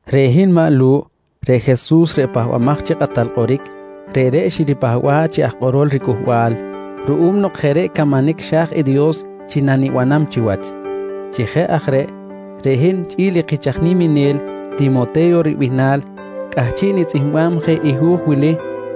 Reꞌ hin maꞌ Lu̱ꞌ, reꞌ Jesus reꞌ Pahbamaj chi Kꞌatal Kꞌoric, reꞌreꞌ xiripahba̱ꞌ chi aj kꞌorol riCꞌuhbal ruꞌum nok jeꞌ reꞌ camanic xa̱j i Dios chi nanibanam chiwach. Chi jeꞌ aj reꞌ, reꞌ hin chꞌi̱l i kich aj niminel Timote̱yo ribihnal, cꞌahchiꞌ nitzꞌihmbam je i hu̱j wili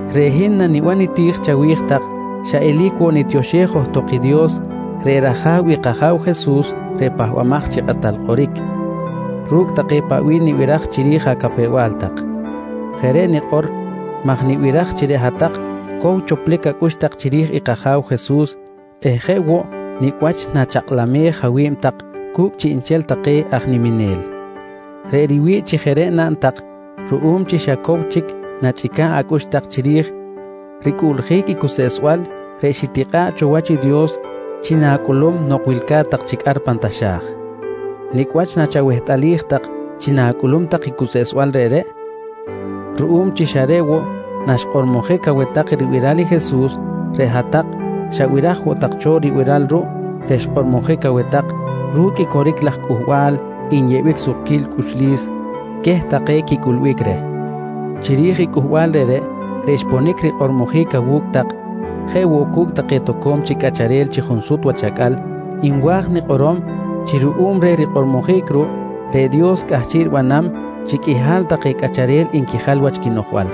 Reꞌ hin naniban niti̱j chawi̱j tak, xa eli̱c woꞌ nitioxej johtok i Dios reꞌ rAja̱w i kAja̱w Jesus reꞌ Pahbamaj chi Kꞌatal Kꞌoric ru̱cꞌ take nibiraj chiri̱j acapew-bal tak. Jeꞌ reꞌ nikꞌor maj nibiraj chi reꞌ hat-tak cow choplic acꞌux tak chiri̱j kAja̱w Jesus eh jeꞌ woꞌ nicꞌ wach nachakꞌlamej awi̱b tak cu̱cꞌ chiꞌnchel take aj niminel. Reꞌ riwi̱ꞌ chi jeꞌ reꞌ naꞌn tak ruꞌum chi xa cow chic nachꞌica̱ꞌ acꞌux tak chiri̱j ricꞌuꞌljic i cuseꞌsbal reꞌ xitikꞌa̱ꞌ cho wach i Dios chi na̱cꞌulum nok wilca̱t tak chic ar pan taxa̱j. Nicꞌ wach nachawehtꞌalij tak chi na̱cꞌulum tak i cuseꞌsbal reꞌreꞌ? Ruꞌum chi xa reꞌ woꞌ naxkꞌormojic aweh tak ribiral i Jesus reꞌ hat-tak xabiraj woꞌ tak cho ribiral ruꞌ reꞌ xkꞌormojic aweh tak ru̱cꞌ i coric laj cꞌuhbal nyeꞌbic sukquil cꞌuxlis queh take quicꞌulbic reh. Chiri̱j i cꞌuhbal reꞌreꞌ, reꞌ xponic rikꞌormojic awu̱cꞌ tak jeꞌ woꞌ cu̱cꞌ take toco̱m chic cꞌacharel chi junsut wach acꞌal, nwa̱j nikꞌorom chi ruꞌum reh rikꞌormojic ruꞌ, reꞌ Dios cꞌahchiꞌ ribanam chi qꞌuihal take cꞌacharel nquijal wach quinoꞌjbal.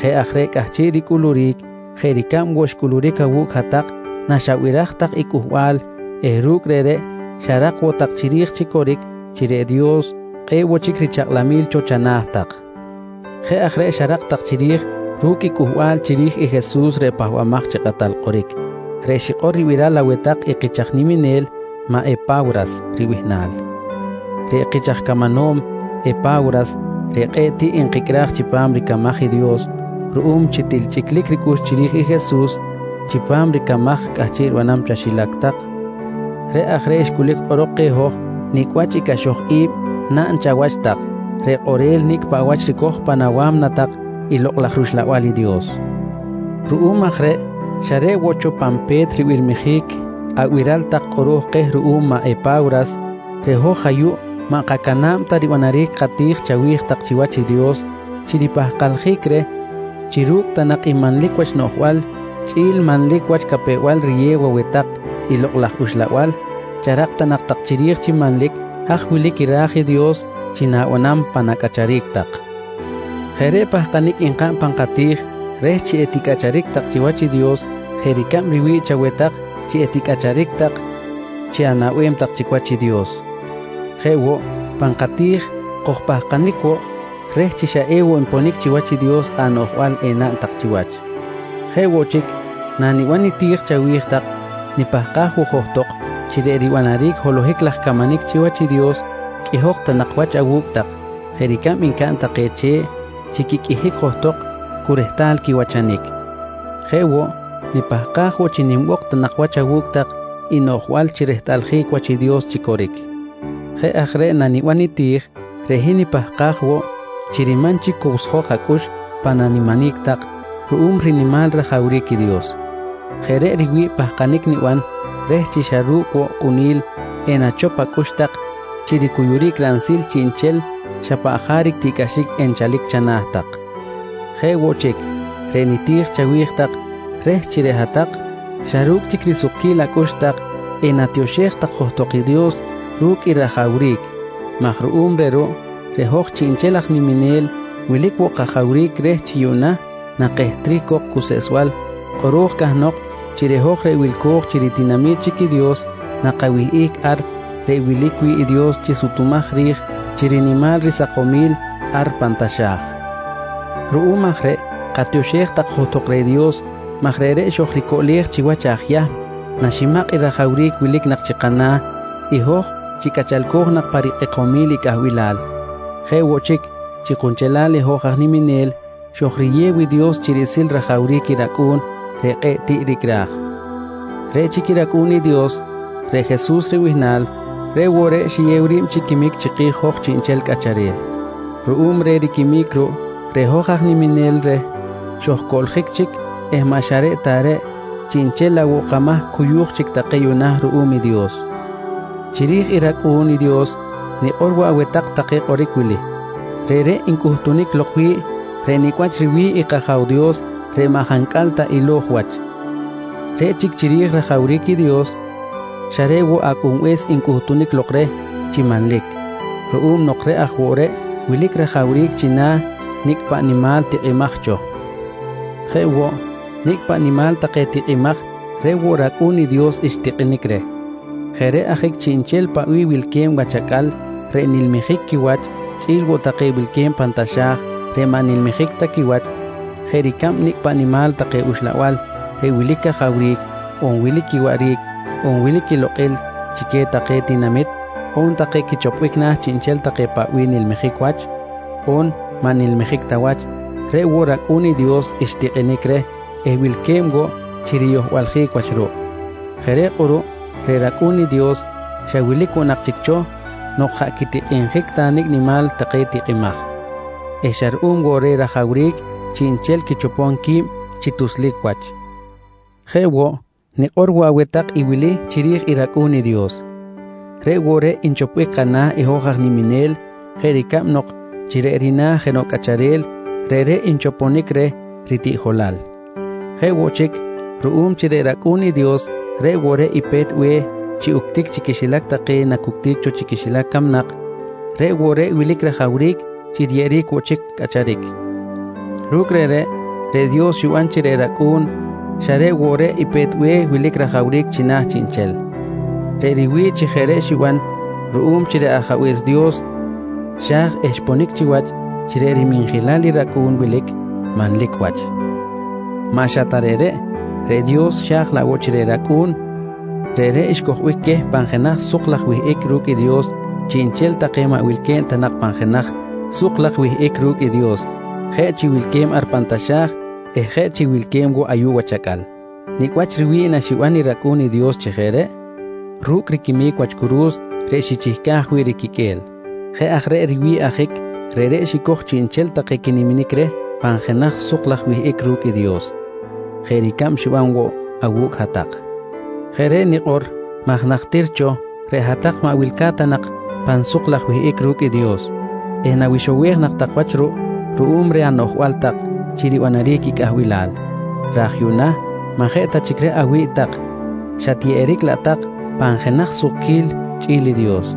Jeꞌ aj reꞌ cꞌahchiꞌ ricꞌuluric jeꞌ ricab woꞌ xcꞌuluric awu̱cꞌ hat-tak naxabiraj tak i cꞌuhbal eh ru̱cꞌ reꞌreꞌ xarak woꞌ tak chiri̱j chi coric chi reꞌ Dios kꞌe̱ꞌ woꞌ chic richakꞌlamil cho chana̱ tak. Jeꞌ aj reꞌ xarak tak chiri̱j ru̱cꞌ i cꞌuhbal chiri̱j i Jesus reꞌ Pahbamaj chi Kꞌatal Kꞌoric, reꞌ xikꞌor ribiral aweh tak i kich aj niminel maꞌ Epa̱wras ribihnal. Reꞌ kich aj camanom Epa̱wras reꞌ kꞌe̱ꞌ tiꞌ nkicꞌraj chipam ricamaj i Dios ruꞌum chi til chꞌiclic ricꞌux chiri̱j i Jesus chipam ricamaj cꞌahchiꞌ ribanam chaxilac tak reꞌ aj reꞌ xcꞌulic kꞌorok keh hoj nicꞌ wach i cꞌaxoj i̱b naꞌn chawach tak reꞌ kꞌorel nicꞌ paꞌ wach ricoj pan awa̱mna tak i Lokꞌ laj rUxlabal i Dios. Ruꞌum aj reꞌ, xa reꞌ woꞌ cho pan pe̱t ribirmijic abiral tak kꞌoro̱j keh ruꞌum maꞌ Epa̱wras, reꞌ hoj ayuꞌ maꞌ kamayam ta ribanaric kati̱j chawi̱j tak chiwach i Dios chi ripahkaljic reh chi ru̱cꞌ ta nak i manlic wach noꞌjbal chꞌi̱l manlic wach capew-bal riyew aweh tak i Lokꞌ laj Uxlabal, charak ta nak tak chiri̱j chi manlic haj wilic i raj i Dios chi na̱banam pan acꞌacharic tak. Jeꞌ reꞌ pahkanic nkaꞌn pan kati̱j reh chi eticꞌacharic tak chiwach i Dios jeꞌ ricab riwi̱ꞌ chaweh tak chi eticꞌacharic tak chi anaꞌbem tak chic wach i Dios. Jeꞌ woꞌ pan kati̱j, kojpahkanic woꞌ reh chi xa ewoꞌ nponic chiwach i Dios anoꞌjbal enaꞌn tak chiwach. Jeꞌ woꞌ chic, naniban niti̱j chawi̱j tak nipahkaj woꞌ johtok chi reꞌ ribanaric holohic laj camanic chiwach i Dios qꞌuihok ta nak wach awu̱cꞌ tak jeꞌ ricab ncaꞌn take che̱ꞌ chi quiqꞌuihic johtok cu rehtal quiwachanic. Jeꞌ woꞌ, nipahkaj woꞌ chi nimbok ta nak wach awu̱cꞌ tak i noꞌjbal chi rehtꞌaljic wach i Dios chi coric. Jeꞌ aj reꞌ naniban niti̱j reꞌ hin nipahkaj woꞌ chi riman chic cowsjok acꞌux pan animinic tak ru̱cꞌ rinimal rajawric i Dios. Jeꞌ reꞌ riwi̱ꞌ pahkanic niban reh chi xa ru̱cꞌ woꞌ kꞌuni̱l enachop acꞌux tak chi ricuyuric ransil chiꞌnchel xa paꞌ jaric tiꞌcꞌaxic enchalic chana̱ tak. Jeꞌ woꞌ chic, reꞌ niti̱j chawi̱j tak reh chi reꞌ hat-tak xa ru̱cꞌ chic risukquil acꞌux tak enatioxej tak johtok i Dios ru̱cꞌ i rajawric maj ruꞌum reh ruꞌ, reꞌ hoj chiꞌnchel aj niminel wilic woꞌ kajawric reh chi yuꞌna nakehtric cok cuseꞌsbal kꞌoro̱j cahnok chi reꞌ hoj reꞌ wilco̱j chi ritinami̱t chic i Dios na kawihꞌic ar reꞌ wilic wi̱ꞌ i Dios chi sutumaj ri̱j chi rinimal risakomil ar pan taxa̱j. Ruꞌum aj reꞌ katioxej johtok reh Dios maj reꞌreꞌ xojricoꞌlej chiwach aj Yahm naximakꞌ i rajawric wilic nak chi kana̱ i hoj chi cꞌachalco̱j nak pa rikꞌekomil i cꞌahbilal. Jeꞌ woꞌ chic, chi kunchelal i hoj aj niminel xojriyew i Dios chi riꞌsil rajawric i rAcꞌu̱n reꞌ kꞌe̱ꞌ tiꞌ ricꞌraj. Reꞌ chic rAcꞌu̱n i Dios, reꞌ Jesus ribihnal, reꞌ woꞌ reꞌ xiyew ri̱b chi quimic chiki̱j hoj chiꞌnchel cꞌacharel. Ruꞌum reh riquimic ruꞌ, reꞌ hoj aj niminel reh xojcoꞌljic chic eh maꞌ xa reꞌ ta reꞌ, chiꞌnchel laꞌ woꞌ kamahc cuyuj chic take yuꞌna ruꞌum i Dios. Chiri̱j i rAcꞌu̱n i Dios nikꞌor woꞌ aweh tak take kꞌoric wili: Reꞌreꞌ ncꞌuhtunic lok wi̱ꞌ reꞌ nicꞌ wach riwi̱ꞌ i kAja̱w Dios reꞌ maꞌ jancꞌal ta ilo̱j wach. Reꞌ chic chiri̱j rajawric i Dios, xa reꞌ woꞌ Acꞌunbe̱s ncꞌuhtunic lok reh chi manlic ruꞌum nok reꞌ aj woꞌ reꞌ wilic rajawric china̱ nicꞌ paꞌ nimal tikꞌimaj cho. Jeꞌ woꞌ, nicꞌ paꞌ nimal take tikꞌimaj reꞌ woꞌ rAcꞌu̱n i Dios xtikꞌinic reh. Jeꞌ reꞌ ajic chiꞌnchel paꞌ bih wilque̱b wach acꞌal reꞌ nilmijic quiwach chꞌi̱l woꞌ take wilque̱b pan taxa̱j reꞌ maꞌ nilmijic ta quiwach, jeꞌ ricab nicꞌ paꞌ nimal take uxlabal reꞌ wilic cajawric, on wilic quiwaꞌric, on wilic quilokꞌil chi queh take tinamit, on take quichopbic na̱ chiꞌnchel take paꞌ bih nilmijic wach, on maꞌ nilmijic ta wach, reꞌ woꞌ rAcꞌu̱n i Dios xtikꞌinic reh eh wilque̱b woꞌ chi riyohbaljic wach ruꞌ. Jeꞌ reꞌ kꞌuruꞌ reꞌ rAcꞌu̱n i Dios xa wilic woꞌ nak chic cho nok jaꞌ quitikꞌinjic ta nicꞌ nimal take tikꞌimaj eh xa ruꞌum woꞌ reh rajawric chiꞌnchel quichopom qui̱b chi tuslic quiwach. Jeꞌ woꞌ nikꞌor woꞌ aweh tak i wili chiri̱j i rAcꞌu̱n i Dios: Reꞌ woꞌ reꞌ nchoponic kana̱ hoj aj niminel jeꞌ ricab nok chi reꞌ rina̱ jenoꞌ cꞌacharel reꞌreꞌ nchoponic je reh ritiꞌjolal. Jeꞌ woꞌ chic, ruꞌum chi reꞌ rAcꞌu̱n i Dios reꞌ woꞌ reꞌ i pe̱t be̱h chi uctic chi quixilac take nacuctic cho chi quixilac camnak, reꞌ woꞌ reꞌ wilic rajawric chi riyeꞌeric woꞌ chic cꞌacharic. Ru̱cꞌ reꞌreꞌ, reꞌ Dios xiban chi reꞌ rAcꞌu̱n xa reꞌ woꞌ reꞌ i pe̱t be̱h wilic rajawric china̱ chiꞌnchel. Reꞌ riwi̱ꞌ chi jeꞌ reꞌ xiban ruꞌum chi reꞌ Ajabe̱s Dios xa̱j eh xponic chiwach chi reꞌ riminjilal i rAcꞌun wilic manlic wach. Maꞌ xa ta reꞌreꞌ, reꞌ Dios xa̱j laꞌ woꞌ chi reꞌ rAcꞌu̱n, reꞌreꞌ xcojbic queh pan jenaj suk laj wihꞌic ru̱cꞌ i Dios chiꞌnchel take maꞌ wilque̱b ta nak pan jenaj suk laj wihꞌic ru̱cꞌ i Dios, jeꞌ chi wilque̱b ar pan taxa̱j eh jeꞌ chi wilque̱b woꞌ ayuꞌ wach acꞌal. Nicꞌ wach riwi̱ꞌ naxiban i rAcꞌu̱n i Dios chi jeꞌ reꞌ? Ru̱cꞌ riquimic wach curu̱s reꞌ xichihcaj wi̱ꞌ riquiqꞌue̱l. Jeꞌ aj reꞌ riwi̱ꞌ ajic reꞌreꞌ xicoj chiꞌnchel take naquiniminic reh pan jenaj suk laj wihꞌic ru̱cꞌ i Dios, jeꞌ ricab xiban cho awu̱cꞌ hat-tak. Jeꞌ reꞌ nikꞌor maj najtir cho reꞌ hat-tak maꞌ wilca̱t ta nak tak pan suk laj wihꞌic ru̱cꞌ i Dios eh nawixowej nak tak wach ruꞌ ruꞌum reh anoꞌjbal tak chi ribanaric i cꞌahbilal. Raj yuꞌna maꞌ jeꞌ ta chic reꞌ awi̱ꞌ tak, xatyeꞌeric laꞌ tak pan jenaj sukquil chꞌi̱l i Dios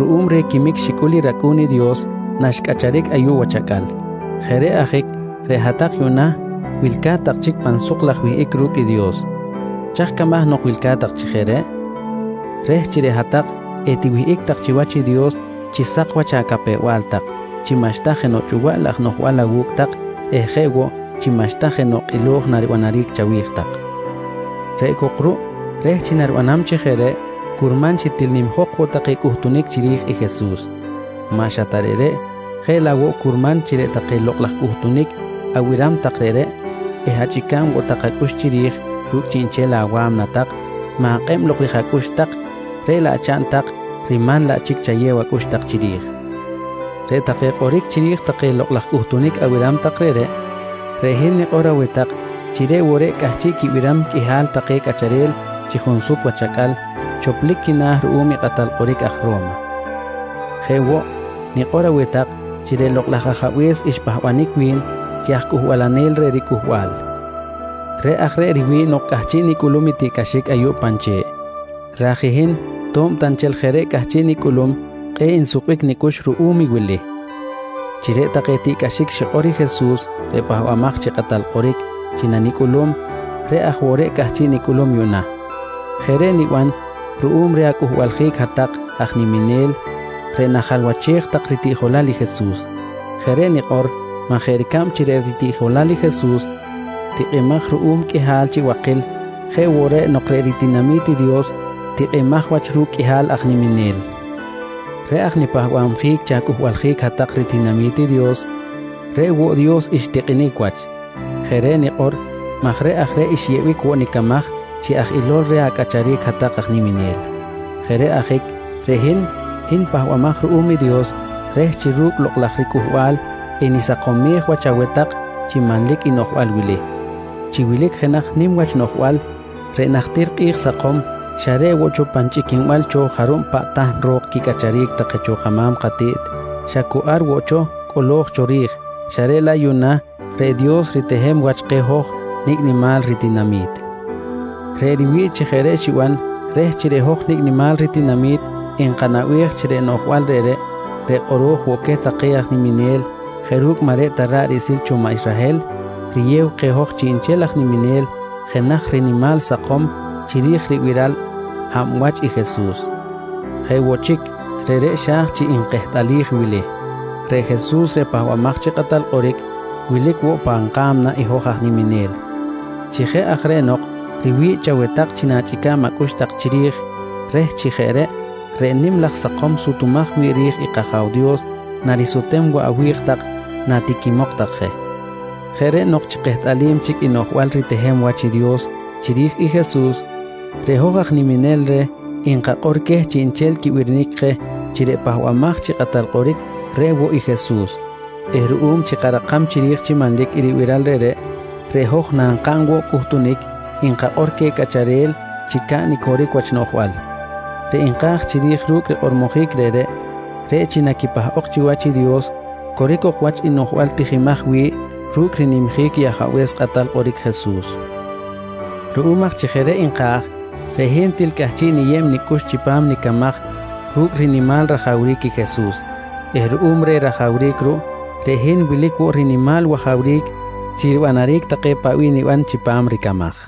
ruꞌum reh quimic xicꞌul i rAcꞌu̱n i Dios naxcꞌacharic ayuꞌ wach acꞌal. Jeꞌ reꞌ ajic reꞌ hat-tak yuꞌna wilca̱t tak chic pan suk laj wihꞌic ru̱cꞌ i Dios. Chaj camaj nok wilca̱t tak chi jeꞌ reꞌ? Reh chi reꞌ hat-tak etiwihꞌic tak chiwach i Dios chi sak wach acapew-bal tak, chi maꞌxta jenoꞌ chꞌuwaꞌ laj noꞌjbal awu̱cꞌ tak eh jeꞌ woꞌ chi maꞌxta jenoꞌ kꞌilo̱j naribanaric chawi̱j tak. Reꞌ cok ruꞌ reh chi naribanam chi jeꞌ reꞌ curman chi til nimjok woꞌ take cꞌuhtunic chiri̱j i Jesus. Maꞌ xa ta reꞌreꞌ, jeꞌ laꞌ woꞌ curman chi reꞌ take lokꞌ laj cꞌuhtunic abiram tak reꞌreꞌ eh achꞌica̱b woꞌ tak acꞌux chiri̱j ru̱cꞌ chiꞌnchel awa̱mna tak, ma̱kꞌeb lok chiri̱j acꞌux tak reꞌ laꞌ chaꞌn tak riman laꞌ chic chayew acꞌux tak chiri̱j. Reꞌ take kꞌoric chiri̱j take lokꞌ laj cꞌuhtunic abiram tak reꞌreꞌ, reꞌ hin nikꞌor aweh tak chi reꞌ woꞌ reꞌ cꞌahchiꞌ quibiram qꞌuihal take cꞌacharel chi junsut wach acꞌal choplic quina̱ ruꞌum i kꞌatal kꞌoric aj Ro̱ma. Jeꞌ woꞌ, nikꞌor aweh tak chi reꞌ Lokꞌ laj Ajabe̱s xpahbanic wi̱n chi aj cꞌuhbalanel reh riCꞌuhbal. Reꞌ aj reꞌ riwi̱ꞌ nok cꞌahchiꞌ nicꞌulum i tiꞌcꞌaxic ayuꞌ pan che̱ꞌ. Raj i hin to̱b ta nchel jeꞌ reꞌ cꞌahchiꞌ nicꞌulum kꞌe̱ꞌ nsukbic nicꞌux ruꞌum i wili: Chi reꞌ take tiꞌcꞌaxic xikꞌor i Jesus reꞌ Pahbamaj chi Kꞌatal Kꞌoric chi nanicꞌulum, reꞌ aj woꞌ reꞌ cꞌahchiꞌ nicꞌulum yuꞌna. Jeꞌ reꞌ niban ruꞌum reh acꞌuhbaljic hat-tak aj niminel reꞌ najalwachej tak ritiꞌjolal i Jesus. Jeꞌ reꞌ nikꞌor maj jeꞌ ricab chi reꞌ ritiꞌjolal i Jesus tikꞌimaj ruꞌum qꞌuihal chi bakil, jeꞌ woꞌ reꞌ nok reꞌ ritinami̱t i Dios tikꞌimaj wach ru̱cꞌ riqꞌuihal aj niminel. Reꞌ aj nipahbabjic chi acꞌuhbaljic hat-tak ritinami̱t i Dios, reꞌ woꞌ Dios xtikꞌinic wach. Jeꞌ reꞌ nikꞌor maj reꞌ aj reꞌ xyeꞌbic woꞌ nicamaj chi aj ilo̱l reh acꞌacharic hat-tak aj niminel. Jeꞌ reꞌ ajic reꞌ hin, hin pahbamaj ruꞌum i Dios reh chi ru̱cꞌ lokꞌ laj riCꞌuhbal enisakomej wach aweh tak chi manlic i noꞌjbal wili: Chi wilic jenaj nim wach noꞌjbal reꞌ najtir kꞌi̱j sakom xa reꞌ woꞌ cho pan chꞌiquinbal cho jarub paꞌ tahn ro̱k quicꞌacharic take cho kama̱m katiꞌt xa cu ar woꞌ cho cꞌolo̱j cho ri̱j, xa reꞌ laꞌ yuꞌna reꞌ Dios ritehem wach keh hoj nicꞌ nimal ritinami̱t. Reꞌ riwi̱ꞌ chi jeꞌ reꞌ xiban reh chi reꞌ hoj nicꞌ nimal ritinami̱t enkanaꞌbej chi reꞌ noꞌjbal reꞌreꞌ, reꞌ kꞌoro̱j woꞌ queh take aj niminel jeꞌ ru̱cꞌ maꞌ reꞌ ta ra̱ꞌ riꞌsil cho maꞌ Israhel riyew keh hoj chiꞌnchel aj niminel jenaj rinimal sakom chiri̱j ribiral hab wach i Jesus. Jeꞌ woꞌ chic, reꞌreꞌ xa̱j chi nkehtꞌalij wili: Reꞌ Jesus reꞌ Pahbamaj chi Kꞌatal Kꞌoric wilic woꞌ pan ka̱mna hoj aj niminel. Chi jeꞌ aj reꞌ nok riwi̱ꞌ chaweh tak chi na̱chꞌica̱b acꞌux tak chiri̱j reh chi jeꞌ reꞌ, reꞌ nim laj sakom sutumaj wi̱ꞌ ri̱j i kAja̱w Dios narisutem woꞌ awi̱j tak natiquimok tak je. Jeꞌ reꞌ nok chi kehtꞌalim chic i noꞌjbal ritehem wach i Dios chiri̱j i Jesus, reꞌ hoj aj niminel reh nkakꞌor queh chiꞌnchel quibirinic keh chi reꞌ Pahbamaj chi Kꞌatal Kꞌoric reꞌ woꞌ i Jesus eh ruꞌum chi karakam chiri̱j chi manlic i ribiral reꞌreꞌ, reꞌ hoj nakaꞌn woꞌ cꞌuhtunic, nkakꞌor queh cꞌacharel chi caꞌn i coric wach noꞌjbal. Reꞌ nka̱j chiri̱j ru̱cꞌ rikꞌormojic reꞌreꞌ, reꞌ chi naquipahꞌok chiwach i Dios, coric ok wach i noꞌjbal tijimaj wi̱ꞌ ru̱cꞌ rinimjic i Ajabe̱s Kꞌatal Kꞌoric Jesus. Ruꞌum aj chi jeꞌ reꞌ nka̱j, reꞌ hin til cꞌahchiꞌ niyeb nicꞌux chipam nicamaj ru̱cꞌ rinimal rajawric i Jesus eh ruꞌum reh rajawric ruꞌ, reꞌ hin wilic woꞌ rinimal wajawric chi ribanaric take paꞌ bih niban chipam ricamaj.